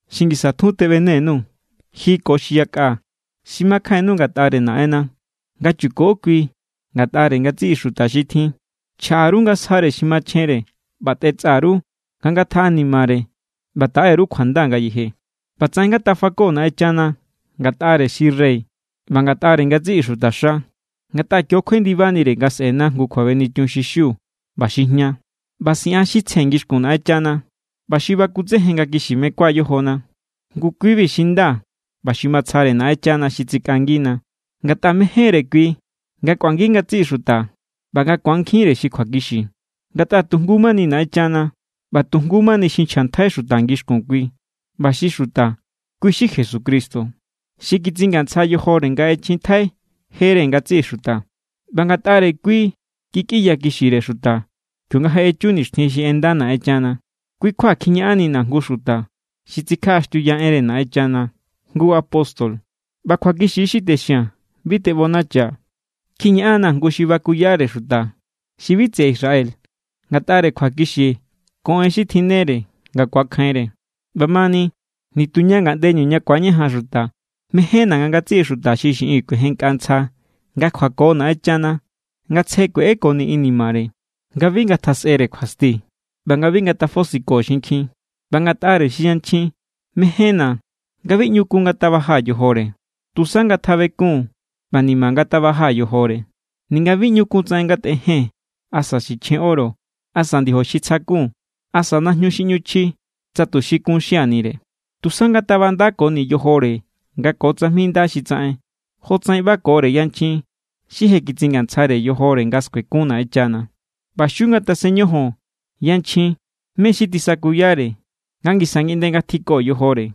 Xi ngisa tjun, teꞌbene_nuu̱ ji ko xi yakꞌa xi makjainnu ngatꞌare Naꞌenna nga chuko kui ngatꞌare ngatsiꞌi xuta xi tjin. Chjaꞌa_ru nga sjare xi machjenre ꞌba tꞌetsꞌa_ru nga ngatjaꞌanimare ꞌba taꞌeru kjuanda ngayeje. ꞌBatsaꞌen ngatafako Naꞌenchana ngatꞌare xi rey ꞌba ngatꞌare ngatsiꞌi xutaxa, ngatꞌa kio= kjuendibanire nga sꞌe̱na jngu kjuabenichun xi xiu ꞌba xi jña, ꞌba siꞌan xi tsje ngixkun Naꞌenchana ꞌba xi bakutsejen nga kixi mekua yojona. Ngu kui=bi xi nda ꞌba xi matsjare Naꞌenchana xi tsikꞌangina. Ngatꞌa mején=re kui nga kꞌuangi ngatsiꞌi xuta ꞌba nga ku̱ankjinre xi kjuakixi. Ngatꞌa tu jngu= mani Naꞌenchana, ꞌba tu jngu= mani xi nchjntjai xuta ngixkun kui ꞌba xi xuta, kui= xi Jesucristo. Xi kitsingantsja yojore nga ꞌechjintjai jere ngatsiꞌi xuta. ꞌBa ngatꞌare kui kikꞌinyakixire xuta kionga je echu nixtjin xi ꞌenda Naꞌenchana. Kui= kjua kjiñaꞌannina̱ jngu xuta xi tsikjaꞌaxtiuya enre Naꞌenchana, jngu apóstol. (ꞌBa kjuakixi= xi texia̱n. Bi teꞌbonachaa̱.) Kjiñaꞌan=na̱ jngu xi bakuyare xuta xi bi tseꞌe Israel ngatꞌare kjuakixi ko en xi tjinnere nga ku̱akjainre. ꞌBamani, nituña ngaꞌndeñu ña ku̱añajan xuta, mejénna̱ nga ngatsiꞌi xuta xi xiꞌin kuejenkꞌa ntsja nga kjuako Naꞌenchana nga tsje kueꞌekoni inimare, nga bi ngatjasꞌere kjuasti ꞌba nga bi ngatafosiko xinkjin. ꞌBa ngatꞌare xi yanchjin, mejénna̱ nga bi ꞌñu kun ngatabaja yojore. Tusa ngatjabekun ꞌba ni̱ma̱ ngatabaja yojore. Ninga bi ꞌñu kun tsaꞌen ngatꞌejen, asa sichjen oro, asa ndiojo xi tsja= kun, asa najñu xi ꞌñu chji tsa tuxi kun xianire. Tusa ngatabandakoni yojore nga ko tsajmi nda xi tsaꞌen, jotsaꞌen ꞌbakore yanchjin xi je kitsingantsjare yojore nga skuekun Naꞌenchana. ꞌBa xiu ngatasen ñojon yanchjin mé= xi tisakuyare nga ngisa ngiꞌnde ngatjiko yojore.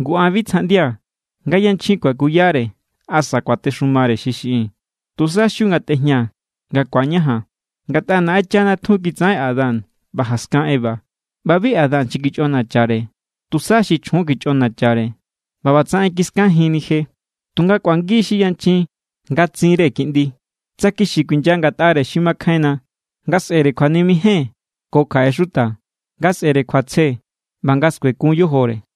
Ngu an bi tsjaꞌndia̱ nga xi yanchjin kuakuyare asa kuatexumare xi xiꞌin. Tusa xiu ngatꞌejña nga ku̱añajan. Ngatꞌa Naꞌenchana tjun kitsaꞌen Adán ꞌba jaskan Eva. ꞌBa bi Adán xi kichꞌonachare. Tusa xi chjun kichꞌonachare ꞌba ꞌbatsaꞌen kiskajinni je. Tunga kꞌuangi xi yanchjin nga tsinre kiꞌndi, tsa kixi kuinya ngatꞌare xi makjainna, nga sꞌere kjuanimejen ko kjaꞌe xuta, nga sꞌere kjuatsje, ꞌba nga skuekun yojore.